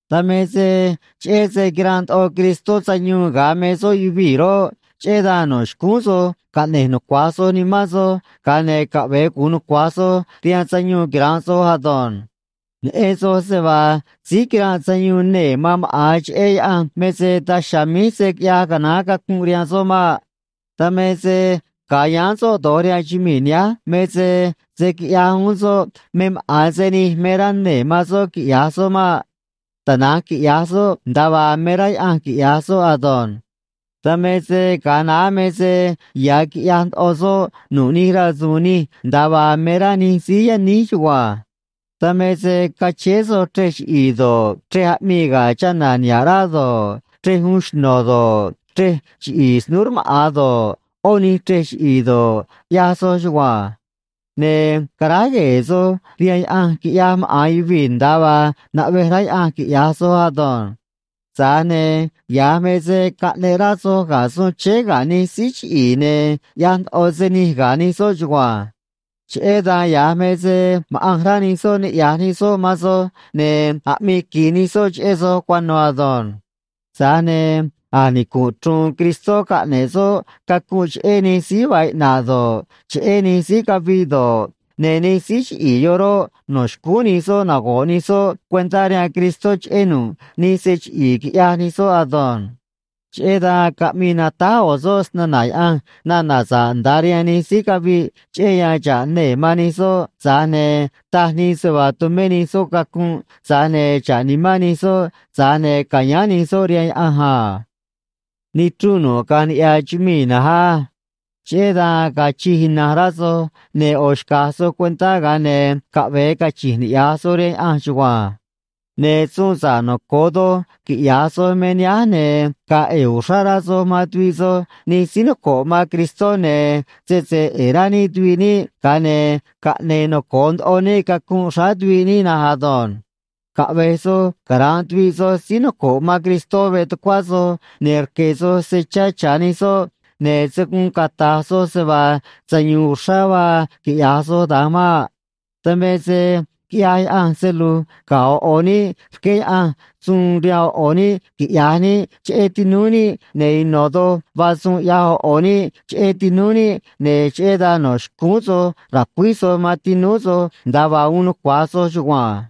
Dan me se cheꞌé se quiranꞌ ndoꞌo Cristó sayuun ga̱a me soꞌ yuvii̱ roꞌ, cheꞌé dan no̱ xcúún soj caꞌne̱j nucua̱j soj nimán soj, ga̱a ne̱ caꞌve̱e gu̱un nucua̱j soj rihaan sayuun quira̱nꞌ soj ado̱nj. Neꞌen soj se vaa síí quiranꞌ sayuun nee̱ man maꞌa̱n cheꞌé Yaꞌanj me se daj chiha̱a̱ míj se̱ quiꞌyaj canaán cacunꞌ rihaan soꞌ maꞌ. Dan me se ga̱a yáán soꞌ do̱j rihaan chumii̱ nihánj me se se̱ quiꞌyaj uún soꞌ me maꞌa̱n se nij me rá nee̱ man soꞌ quiꞌya̱j soꞌ maꞌ. Tana̱nj quiꞌya̱j soꞌ nda̱a vaa me rá Yaꞌanj quiꞌya̱j soꞌ ado̱nj. Dan me se ga̱a naá me se ya̱ quiꞌyaj ndoꞌo soj nu̱ꞌ nij rasu̱u̱n nij nda̱a vaa me rá nij síí yaníj chugua̱nj. Dan me se cachéé soj chrej chiꞌi̱i̱ do̱ꞌ, chrej aꞌmii ga̱ chana̱ niha̱ꞌ rá do̱ꞌ, chrej uun xno̱ do̱ꞌ, chrej chiꞌi̱i̱ snúú rmaꞌa̱n do̱ꞌ, ꞌó nij chrej chiꞌi̱i̱ do̱ꞌ, ꞌyaj soj chugua̱nj. Ne̱ caráj gue̱e̱ soj rihaan yaꞌanj quiꞌyaj maꞌa̱n yuvii̱ nda̱a vaa naꞌvej rá Yaꞌanj quiꞌya̱j soj ado̱nj. Tza̱j ne̱ ya̱j me se caꞌneꞌ rá soj ga̱ suun chéé ga̱ nij síí chiꞌi̱i̱ ne̱ ꞌyaj ndoꞌo se nij ga̱ nij soꞌ chugua̱nj. Cheꞌé dan ya̱j me se maꞌanj rá nij soꞌ niꞌya̱j nij soꞌ man soj, ne̱ aꞌmii qui̱j nij soꞌ cheꞌé soj cuano̱ ado̱nj. Tza̱j ne̱ a̱j nicu̱nꞌ chru̱u̱n Cristó caꞌne̱ꞌ soꞌ cacunꞌ cheꞌé nij síí vaa iꞌna̱ꞌ do̱ꞌ, cheꞌé nij síí caviꞌ do̱ꞌ, ne̱ nij síí chiꞌi̱i̱ yoꞌ roꞌ, no̱ xcúún nij soꞌ nago̱ꞌ nij soꞌ cuentá rihaan Cristó cheꞌé nu̱ꞌ nij se chiꞌi̱i̱ quiꞌyaj nij soꞌ ado̱nj. Cheꞌé dan caꞌmii natáj ꞌo̱ soꞌ snana̱ Yaꞌanj nana̱ sa̱ꞌ nda̱a rihaan nij síí caviꞌ, cheꞌé yan xa̱ꞌ nee̱ man nij soꞌ, tza̱j ne̱ taj nii se vaa tumé nij soꞌ cacunꞌ, tza̱j ne̱ xa̱ꞌ nimán nij soꞌ, tza̱j ne̱ ca̱yáán nij soꞌ rihaan Yaꞌanj a. Nichrunꞌ nu̱ꞌ caꞌa̱nj niꞌya̱ chumii̱ na̱nj á. Cheꞌé dan ga̱a̱ chij ina̱nj rá soj, ne̱ ꞌo̱ xca̱j soj cuentá, ga̱a ne̱ caꞌve̱e cachi̱nj niꞌya̱j soj rihaan Yaꞌanj chugua̱nj. Ne̱ suun sa̱ꞌ noco̱o doj quiꞌya̱j soj me nihánj, ne̱ ga̱a̱ ꞌe̱e̱ uxrá rá soj man tuviꞌ soj nij síí noco̱ꞌ man Cristó, ne̱ sese ꞌe̱e̱ rá níꞌ tuviꞌ níꞌ, ga̱a ne̱ caꞌne̱e̱ noco̱o ndoꞌo níꞌ cacunꞌ xráá tuviꞌ níꞌ na̱nj ado̱nj. Caꞌve̱j soj cara̱nꞌ tuviꞌ soj síí noco̱ꞌ man Cristó veꞌ tucuá soj, ne̱ rque̱ soj se chá cha̱ nij soꞌ, ne̱ se̱ guun cata̱j soj se vaa sayu̱u̱n uxrá vaa quiꞌya̱j soj da̱nj maꞌ. Dan me se quiꞌyaj Yaꞌanj se lu̱j ga̱ ꞌo̱ ꞌo̱ níꞌ, rqué Yaꞌanj suun rihaan ꞌo̱ ꞌo̱ níꞌ quiꞌya̱j níꞌ cheꞌé tinúú níꞌ, ne̱ ino̱ doj vaa suun ꞌyaj ꞌo̱ ꞌo̱ níꞌ cheꞌé tinúú níꞌ, ne̱ cheꞌé dan no̱ xcúún soj ra̱cuíj soj man tinúú soj, nda̱a vaa uun nucua̱j soj chugua̱nj.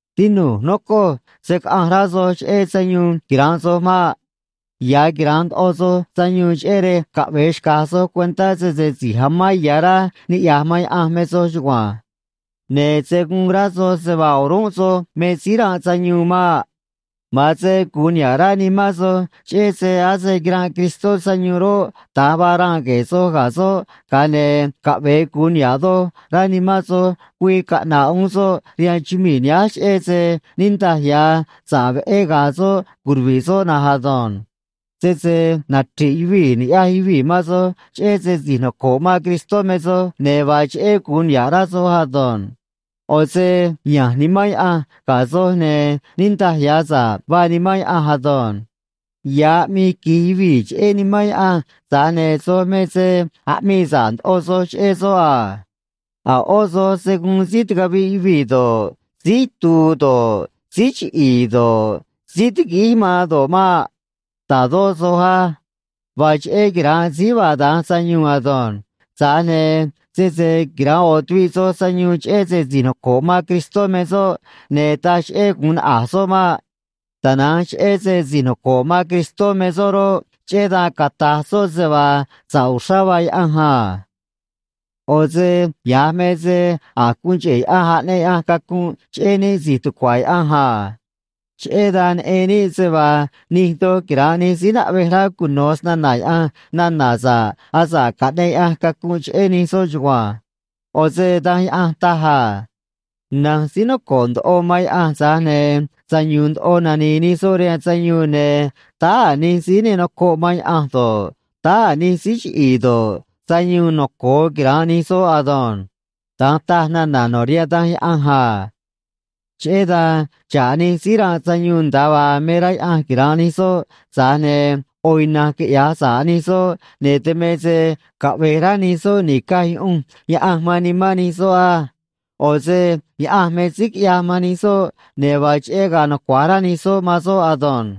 Tinu̱j, nocoj, se̱ caꞌanj rá soj cheꞌé sayuun quira̱nꞌ soj maꞌ. Ya̱ quira̱nꞌ ndoꞌo soj sayuun, cheꞌé rej caꞌve̱e xca̱j soj cuentá sese si̱j amán ya̱ rá niꞌya̱j man Yaꞌanj me soj chugua̱nj. Ne̱ se̱ guun rá soj se vaa o̱rúnꞌ soj me síí ranꞌ sayuun maꞌ. Ma̱an se gu̱un niha̱ꞌ rá nimán soj cheꞌé se ase quiranꞌ Cristó sayuun roꞌ, da̱nj vaa ranꞌ gue̱e̱ soj ga̱ soꞌ, ga̱a ne̱ caꞌve̱e gu̱un niha̱ꞌ doj rá nimán soj güii caꞌna̱ꞌ uún soꞌ rihaan chumii̱ nihánj, cheꞌé se niꞌndaj ya̱ sa̱ꞌ veꞌé ga̱a̱ soꞌ curuvi̱ꞌ soꞌ na̱nj ado̱nj. Sese nachri̱ꞌ yuvii̱ ni̱ꞌyaj yuvii̱ man soj cheꞌé se si̱j noco̱ꞌ man Cristó me soj, ne̱ vaa cheꞌé gu̱un niha̱ꞌ rá soj ado̱nj. ꞌO̱ se ya̱nj Nimán Yaꞌanj ga̱ soj, ne̱ niꞌndaj ya̱ sa̱ꞌ vaa Nimán Yaꞌanj ado̱nj. Ya̱ aꞌmii qui̱j yuvii̱ cheꞌé Nimán Yaꞌanj, tza̱j ne̱ soj me se aꞌmii sa̱ꞌ ndoꞌo soj cheꞌé soꞌ a. A̱ ꞌó soj se̱ guun síí ticaviꞌ yuvii̱ do̱ꞌ, síí itu̱u̱ do̱ꞌ, síí chiꞌi̱i̱ do̱ꞌ, síí tiguíj man do̱ꞌ maꞌ. Ta̱dó soj á. Vaa cheꞌé quira̱nꞌ síí vaa da̱nj sayuun ado̱nj. Tza̱j ne̱ sese quira̱nꞌ ꞌo̱ tuviꞌ soj sayuun cheꞌé se si̱j noco̱ꞌ man Cristó me soꞌ, ne̱ taj cheꞌé gu̱un naꞌa̱j soꞌ maꞌ. Tana̱nj cheꞌé se si̱j noco̱ꞌ man Cristó me soꞌ roꞌ, cheꞌé dan cata̱j soꞌ se vaa sa̱ꞌ uxrá vaa Yaꞌanj a. ꞌO̱ se ya̱j me se a̱j guun cheꞌe̱ Yaꞌanj aꞌneꞌ Yaꞌanj cacunꞌ cheꞌé níꞌ si̱j tucua̱ Yaꞌanj a. Cheꞌé dan neꞌen níꞌ se vaa nij doj quira̱nꞌ nij síí naꞌvej rá cuno̱ snana̱ Yaꞌanj nana̱ sa̱ꞌ asa̱ꞌ caꞌneꞌ Yaꞌanj cacunꞌ cheꞌé nij soꞌ chugua̱nj. ꞌO̱ se Danj Yaꞌanj taj a: Na̱nj síí noco̱ꞌ ndoꞌo man Yaꞌanj, tza̱j ne̱ sayu̱u̱n ndoꞌo nani̱i̱ nij soꞌ rihaan sayuun, ne̱ táá a̱ nij síí ne nocoꞌ man Yaꞌanj do̱ꞌ, táá a̱ nij síí chiꞌi̱i̱ do̱ꞌ, sayuun noco̱o quira̱nꞌ nij soꞌ ado̱nj. Da̱nj taj nana̱ no̱ rihaan Danj Yaꞌanj a. Cheꞌé dan xa̱ꞌ nij síí ranꞌ sayuun nda̱a vaa me rá Yaꞌanj quira̱nꞌ nij soꞌ, tza̱j ne̱ ꞌo̱ ina̱nj quiꞌya̱j sa̱ꞌ nij soꞌ, ne̱ dan me se caꞌve̱j rá nij soꞌ ni̱caj yuꞌunj Yaꞌanj man nimán nij soꞌ á. ꞌO̱ se Yaꞌanj me síí quiꞌyaj man nij soꞌ, ne̱ vaa cheꞌé ga̱a̱ nucua̱j rá nij soꞌ man soꞌ ado̱nj.